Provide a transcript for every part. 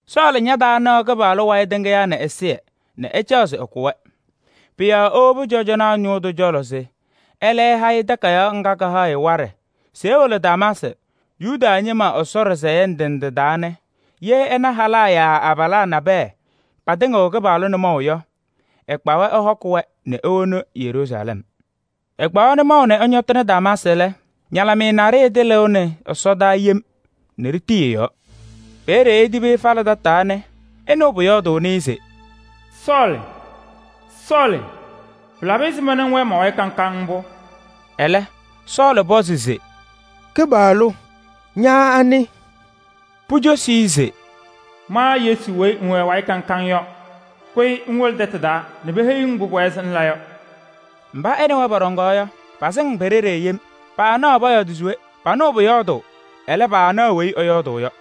Sɔɔlɩ ñataanaɣ Kɩpaɣlʋ wayɩ tɩŋɩyaa nɛ ɛzɩyɛ nɛ ɛcaɣ se ɛkʋ-wɛ. Pʋ-yɔɔ ewobi cɔjɔnaa ñʋʋ tʋ cɔlɔ se ɛlɛ ɛha-ɩ takayaɣ ŋga kahaɣ-ɩ waɖɛ se ewolo Damaasɩ Yuda ñɩma Ɛsɔ ɖɩsɛyɛ ndɩ ndɩ taa nɛ ye ɛna halaa yaa abalaa nabɛyɛ patɩŋɩɣ Kɩpaɣlʋ nʋmɔʋ yɔ, ɛkpa-wɛ ɛhɔkɩ-wɛ nɛ ewoni Yeruusalɛm. Ɛkpaɣ nʋmɔʋ nɛ ɛñɔtɩnɩ Damaasɩ lɛ, ñalɩmɩyɛ naɖɩyɛ tɩlɩʋnɩ ɛsɔdaa yem nɛ ɖitii ɛ-yɔɔ. Peeye etibi ɛfalɩ tataa nɛ ɛnɩɣ pʋyɔɔdʋʋnɩ-ɩ se: “Sɔɔlɩ! Sɔɔlɩ! Pɩlabɩ ɛzɩma nɛ ŋwɛɛ ma-wayɩ kaŋ kaŋ mbʋ?” Ɛlɛ Sɔɔlɩ pɔzɩ se: “Kɩpaɣlʋ! Ña anɩ?” Pucosi-i se: “Ma Yesu weyi ŋwɛ ɛ-wayɩ kaŋ kaŋ yɔ. Kʋyɩ ŋwolo tɛtʋ taa nɛ peheyi-ŋ mbʋ pʋwɛɛ se ŋla yɔ.” Mba ɛ nɛ wɛ pɔɖɔŋaɣ yɔ, pasɩŋ pe-ɖeɖe yem, paanaɣ pɔyɔɔdɩ se we: panɩɣ pʋyɔɔdʋʋ, ɛlɛ, paanaɣ weyi ɛyɔɔdʋʋ yɔ.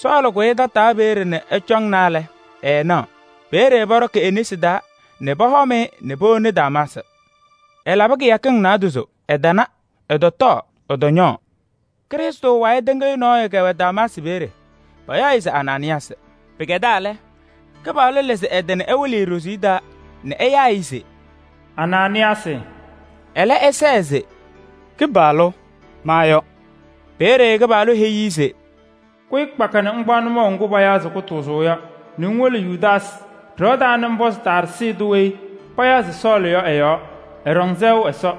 Sɔɔlɩ kʋyɩ tataa peeye nɛ ɛcɔŋna lɛ, ɛɛnaɣ. Peeye pɔɖɔkɩ e-nesi taa nɛ pɔhɔm-ɩ nɛ powoni Damaasɩ. Ɛlabɩ kɩyakɩŋ naadozo, ɛtana, ɛtɔtɔɔ, ɛtɔñɔɔ. Krɩstʋ wayɩ tɩŋɩyʋ nɔɔyʋ kɛwɛ Damaasɩ peeye, payaɣ-ɩ se Anaanɩyaasɩ. Pɩkɛdaa lɛ, Kɩpaɣlʋ lɩzɩ ɛ-tɩ nɛ ɛwɩlɩ-ɩ ɖoziye taa nɛ ɛyaa-ɩ se: “Anaanɩyaasɩ!” Ɛlɛ ɛsɛɛ se: “Kɩpaɣlʋ! Ma yɔ.” Peeye Kɩpaɣlʋ heyi-i se: “Kʋyɩ kpaka nɛ ŋkpaɣ nʋmɔʋ ŋgʋ payaɣ se Kʋtʋʋzʋʋ yɔ nɛ ŋwolo Yudaasɩ ɖɩɣa taa nɛ ŋpɔzɩ Taarsɩ tʋ weyi payaɣ se Sɔɔlɩ yɔ ɛ-yɔɔ, ɛɖɔŋ sɛʋ Ɛsɔ.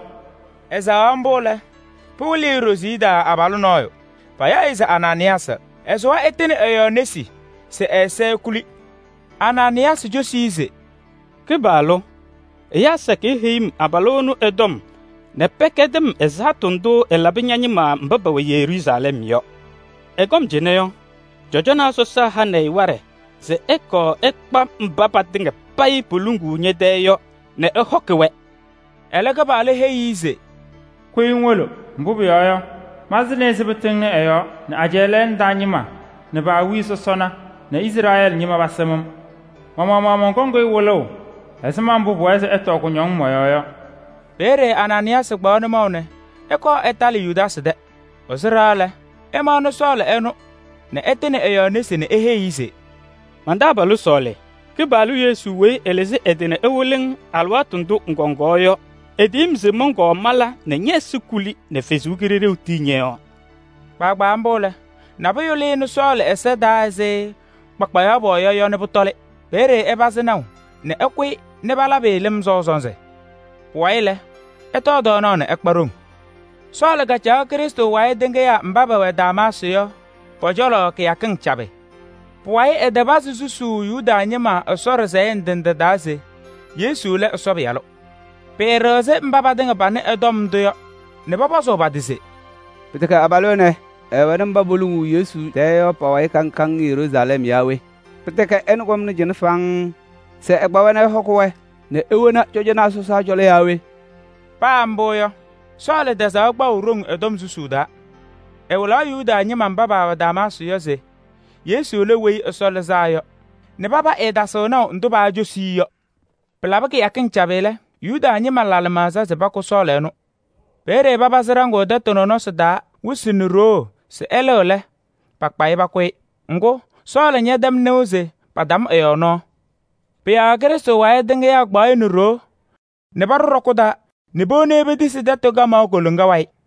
Ɛsɛɣaɣ mbʋ lɛ, pɩwɩlɩ-ɩ ɖoziye taa abalʋ nɔɔyʋ, payaɣ-ɩ se Anaanɩyaasɩ, ɛsʋwa ɛtɩnɩ ɛ-yɔɔ nesi se ɛ-ɛza ekuli.” Anaanɩyaasɩ cosi-i se: “Kɩpaɣlʋ! Ɛyaa sakɩyɛ heyi-m abalʋ ɛnʋ ɛ-tɔm nɛ pɛkɛdɩ-m ɛzaɣtʋ ndʋ ɛlabɩ ña-ñɩma mba pɛwɛ Yeruusalɛm yɔ. Ɛkɔm cɩnɛ yɔ, cɔjɔnaa sɔsaa hanɩ-ɩ waɖɛ se ɛkɔɔ ɛkpa mba patɩŋa payɩ poluŋuu ñɛ-tɛɛ yɔ nɛ ɛhɔkɩ-wɛ.” Ɛlɛ, Kɩpaɣlʋ heyi-i se: “Kʋyɩ ŋwolo, mbʋ pʋyɔɔ yɔ, malɩzɩnɩ-ɩ se pɩtɩŋnɩ ɛ-yɔɔ nɛ ajɛɛ lɛɛna taa ñɩma nɛ pa-awiya sɔsɔna nɛ Izrɛɛlɩ ñɩma pasɩm-m. Ma-maɣmaɣ mɔnkɔŋ-ɩ wɩlʋʋ ɛzɩma mbʋ pʋwɛɛ se ɛtɔɔ kʋñɔŋ mɔ-yɔɔ yɔ.” Peeye Anaanɩyaasɩ kpaɣ nʋmɔʋ nɛ ɛkɔɔ ɛtalɩ Yudaasɩ tɛ. Ɛsʋ ɖɩɣa lɛ, ɛmaɣnɩ Sɔɔlɩ ɛnʋ nɛ ɛtɩnɩ ɛ-yɔɔ nesi nɛ eheyi-i se: “Man-taabalʋ Sɔɔlɩ! Kɩpaɣlʋ Yesu weyi ɛlɩzɩ ɛ-tɩ nɛ ɛwɩlɩ-ŋ alɩwaatʋ ndʋ ŋkɔŋaɣ yɔ, etiyini-m se mɔnkɔɔ mala nɛ ñɛ-ɛza kuli nɛ Ɛsɔ Kalɩzaɣ tii ñɔ-yɔɔ.” Kpaagbaa mbʋ lɛ, nabʋyʋ lɩnɩ Sɔɔlɩ ɛza taa ɛzɩ kpakpayaɣ pɔɔya yɔ nɛ pʋtɔlɩ. Peeye ɛpazɩ naʋ nɛ ɛkʋyɩ nɛ palabɩ-ɩ lɩm sɔʋ sɔnzɩ. Pʋwayɩ lɛ, ɛtɔɔ tɔɔnaɣ nɛ ɛkpa ɖoŋ. Sɔɔlɩ susuu Ɛsɔtɔm Damaasɩ yɔ Sɔɔlɩ kacaɣ Krɩstʋ wayɩ tɩŋɩyaa mba pɛwɛ Damaasɩ yɔ pɔ-cɔlɔ kɩyakɩŋ cabɩ. Pʋwayɩ ɛtɩpazɩ susuu Yuda ñɩma Ɛsɔ ɖɩsɛyɛ ndɩ ndɩ taa se Yesu lɛ Ɛsɔ Pɩyalʋ. Pɩɩɖɩɣzɩ mba patɩŋa panɩ ɛ-tɔm ndʋ yɔ nɛ pɔpɔzʋʋ pa-tɩ se: “Pɩtɛkɛ abalʋ ɛnɛ ɛɛwɛnɩ mba poluŋuu Yesu tɛɛ yɔ pa-wayɩ kaŋ kaŋ Yeruusalɛm yaa we? Pɩtɛkɛ ɛnʋ kɔmnɩ cɩnɛ faŋŋ se ɛkpa-wɛ nɛ ɛhɔkɩ-wɛ nɛ ewoni cɔjɔnaa sɔsaa cɔlɔ yaa we?” Paa mbʋ yɔ, Sɔɔlɩ tɛzaɣ kpaʋ ɖoŋ ɛ-tɔm susuu taa: ɛwɩlaɣ Yuda ñɩma mba paawɛ Damaasɩ yɔ se Yesu lɛ Weyi Ɛsɔ Lɩzaa Yɔ nɛ paba ɛɛtasɩɣ naʋ ndʋ paacosi-i yɔ. Pɩlabɩ kɩyakɩŋ cabɩ lɛ, Yuda ñɩma la lɩmaɣza se pakʋ Sɔɔlɩ ɛnʋ. Peeye papazɩ ɖaŋʋʋ tɛtʋ nɔnɔsɩ taa wɩsɩ nɛ ɖoo se ɛlɩɣ lɛ, pakpa-ɩ pakʋ-ɩ. Ŋgʋ, Sɔɔlɩ ñaatɛm nɩʋ se patam ɛ-yɔɔ nɔɔ. Pʋ-yɔɔ Krɩstʋ wayɩ tɩŋɩyaa kpaɣ-ɩ nɛ ɖoo nɛ paɖʋ ɖɔkʋ taa nɛ powoni-i petisi tɛtʋ kamaɣ koloŋa wayɩ.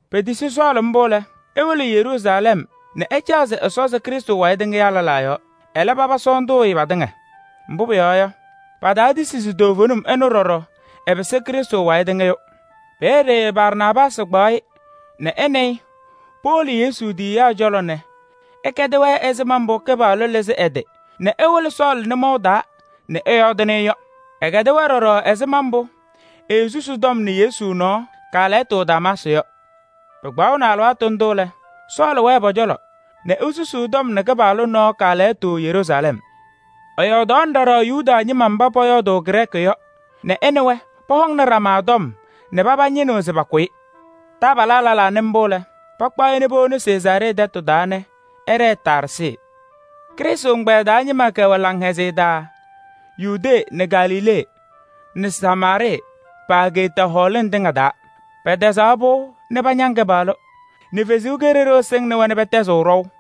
Petisi Sɔɔlɩ mbʋ lɛ, ewolo Yeruusalɛm nɛ ɛcaɣ se ɛsɔzɩ Krɩstʋ wayɩ tɩŋyaa lɛlaa yɔɔ, ɛlɛ, paba sɔɔndʋʋ-ɩ patɩŋa. Mbʋ pʋyɔɔ yɔ, pataatisi se toovenim ɛnʋ ɖɔɖɔ ɛpɩsɩ Krɩstʋ wayɩ tɩŋɩyʋ. Peeye Barnaabaasɩ kpaɣ-ɩ nɛ ɛ nɛ ɩ powolo Yesu tiyiyaa cɔlɔ nɛ ɛkɛdɩ-wɛ ɛzɩma mbʋ Kɩpaɣlʋ kalɩzɩ ɛ-tɩ nɛ ɛwɩlɩ Sɔɔlɩ nʋmɔʋ taa nɛ ɛyɔɔdɩnɩ-ɩ yɔ. Ɛkɛdɩ-wɛ ɖɔɖɔ ɛzɩma mbʋ eesusi tɔm nɛ Yesu nɔɔ kaalɛyɩtʋ Damaasɩ yɔ. Pɩkpaɣnɩ alɩwaatʋ ndʋ lɛ, Sɔɔlɩ wɛɛ pɔ-cɔlɔ nɛ esusuu tɔm nɛ Kɩpaɣlʋ nɔɔ kaalɛyɩtʋ Yeruusalɛm. Ɛyɔɔdaɣnɩ ɖɔɖɔ Yuda ñɩma mba pɔyɔɔdʋʋ Grɛɛkɩ yɔ nɛ ɛ nɛ wɛ pɔhɔŋnɩ ɖama tɔm nɛ paba ñɩnɩɣ se pakʋ-ɩ. Taabalaa lɛlaa nɩ mbʋ lɛ, pakpaɣ-ɩ nɛ powoni Sezaaree tɛtʋ taa nɛ ɛɖɛɛ Taarsɩ. Krɩstʋ ɛgbɛyɛ taa ñɩma kɛwɛ laŋhɛzɩyɛ taa Yudee nɛ Galilee nɛ Samaarɩɩ pa-ageeta hɔɔlɩŋ tɩŋa taa. Pɛtɛzaɣ pɩʋ nɛ pañaŋ Kɩpaɣlʋ nɛ Ɛsɔ Kalɩzaɣ sɩŋnɩ-wɛ nɛ pɛtɛzɩɣ ɖɔʋ.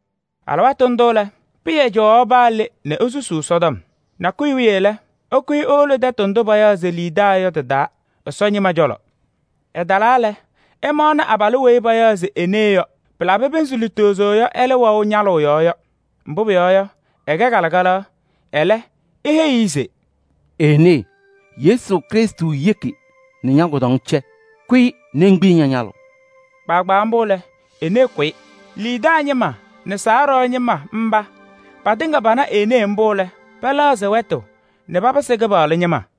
Alɩwaatʋ ndʋ lɛ, Pɩyɛ cɔwaɣ paa le nɛ esusuu Ɛsɔtɔm. Nakʋyʋ wiye lɛ, ɛkʋyɩ ewolo tɛtʋ ndʋ payaɣ se Liidaa yɔ tɩ-taa Ɛsɔ ñɩma cɔlɔ. Ɛtalaa lɛ, ɛmaɣnɩ abalʋ weyi payaɣ se Enee yɔ, pɩlabɩ pɩnzɩ lutozo yɔ ɛlɛ wɛʋ ñalʋʋ yɔɔ yɔ, mbʋ pʋyɔɔ yɔ, ɛkɛ kalɩkalaɣ. Ɛlɛ eheyi-i se: “Enee! Yesu Krɩstʋ yeki nɛ ña-kʋdɔŋ cɛ, kʋyɩ ŋkpiyi ña-ñalʋʋ.” Kpaagbaa mbʋ lɛ, Enee kʋyɩ. Liidaa ñɩma nɛ Sarɔɔ kataŋa taa ñɩma mba patɩŋa pana Enee mbʋ lɛ, pɛlɛɣzɩ wɛtʋ nɛ papɩsɩ Kɩpaɣlʋ ñɩma.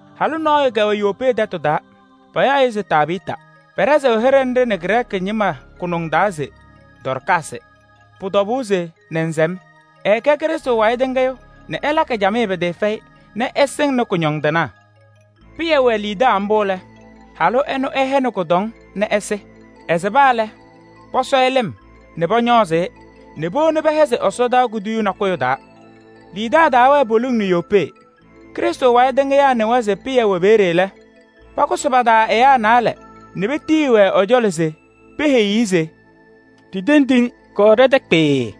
Halʋ nɔɔyʋ kɛwɛ Yopee tɛtʋ taa, payaɣ-ɩ se Tabɩɩta, Grɛɛkɩ ñɩma yɔɔdaɣ taa se: “Dɔɔrkaasɩ.” Pʋ-tɔbʋʋ se nɛnzɛm. Ɛɛkɛ Krɩstʋ wayɩ tɩŋɩyʋ nɛ ɛlakɩ camɩyɛ pɩtɩɩfɛyɩ nɛ ɛsɩŋnɩ kʋñɔndɩnaa. Pɩyɛ wɛ Liidaa mbʋ lɛ, halʋ ɛnʋ ɛhɛnɩ kʋdɔŋ nɛ ɛsɩ. Ɛsɩba lɛ, pɔsɔ-ɩ lɩm nɛ pɔñɔɔzɩ-ɩ nɛ powoni pɛhɛzɩ ɛsɔdaa kuduyuu nakʋyʋ taa. Liidaa taawɛɛ poliŋ nɛ Yopee. Ɛzɩma mbʋ Krɩstʋ wayɩ tɩŋɩyaa kɛtɛm nɩʋ se Pɩyɛ wɛ peeye lɛ, pakʋsɩ pa-taa ɛyaa naalɛ nɛ petiyi-wɛ ɛ-cɔlɔ se peheyi-i se: “Ɖitendi-ŋ, kɔɔ ɖɛ-tɛ kpɩɩɩ.”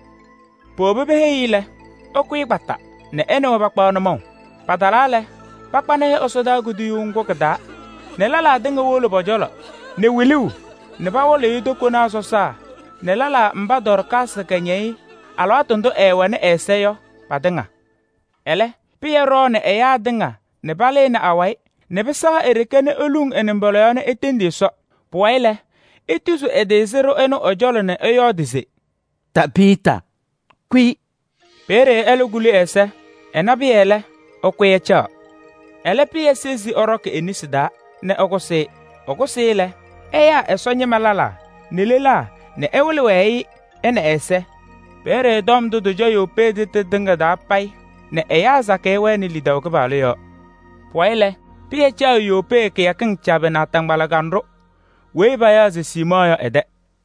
Powobi peheyi-i lɛ, ɛkʋyɩ kpaka nɛ ɛ nɛ wɛ pakpaɣ nʋmɔʋ. Patalaa lɛ, pakpanɩ-ɩ ɛsɔdaa kuduyuu ŋgʋ kɩ-taa nɛ lelaa tɩŋa wolo pɔ-cɔlɔ nɛ wiluu nɛ pawɩlɩɣ-ɩ tokonaa sɔsaa nɛ lɛlaa mba Dɔɔrkaasɩ kɛñɛyɩ alɩwaatʋ ndʋ ɛɛwɛnɩ ɛ-ɛza yɔ patɩŋa. Ɛlɛ Pɩyɛ ɖɔɔnɩ ɛyaa tɩŋa nɛ palɩnɩ awayɩ nɛ pɩsɛɣ e-ɖeke nɛ eluŋ ɛ-nɩmbɔla yɔɔ nɛ etendi Ɛsɔ. Pʋwayɩ lɛ, etuzi ɛ-tɩ sɩɖʋ ɛnʋ ɛ-cɔlɔ nɛ ɛyɔɔdɩ se: “Tabɩɩta! Kʋyɩ!” Peeye ɛlɛ kuli ɛ-ɛza. Ɛna Pɩyɛ lɛ, ɛkʋyɩ ɛcaɣ. Ɛlɛ Pɩyɛ sezi ɛɖɔkɩ e-nesi taa nɛ ɛkʋsɩ-ɩ. Ɛkʋsɩ-ɩ lɛ, ɛyaa Ɛsɔ ñɩma lɛlaa nɛ lelaa nɛ ɛwɩlɩ-wɛ-ɩ, ɛ nɛ ɛ-ɛza. Peeye tɔm ndʋ tɩcɔ Yopee tɛtʋ tɩŋa payɩ nɛ ɛyaa sakɩyɛ wɛnɩ lidaʋ Kɩpaɣlʋ yɔɔ. Pʋwayɩ lɛ, Pɩyɛ caɣ Yopee peeye kɩyakɩŋ cabɩ naataŋgbala kanɖʋ weyi payaɣ se Siimɔɔ yɔ ɛ-tɛ.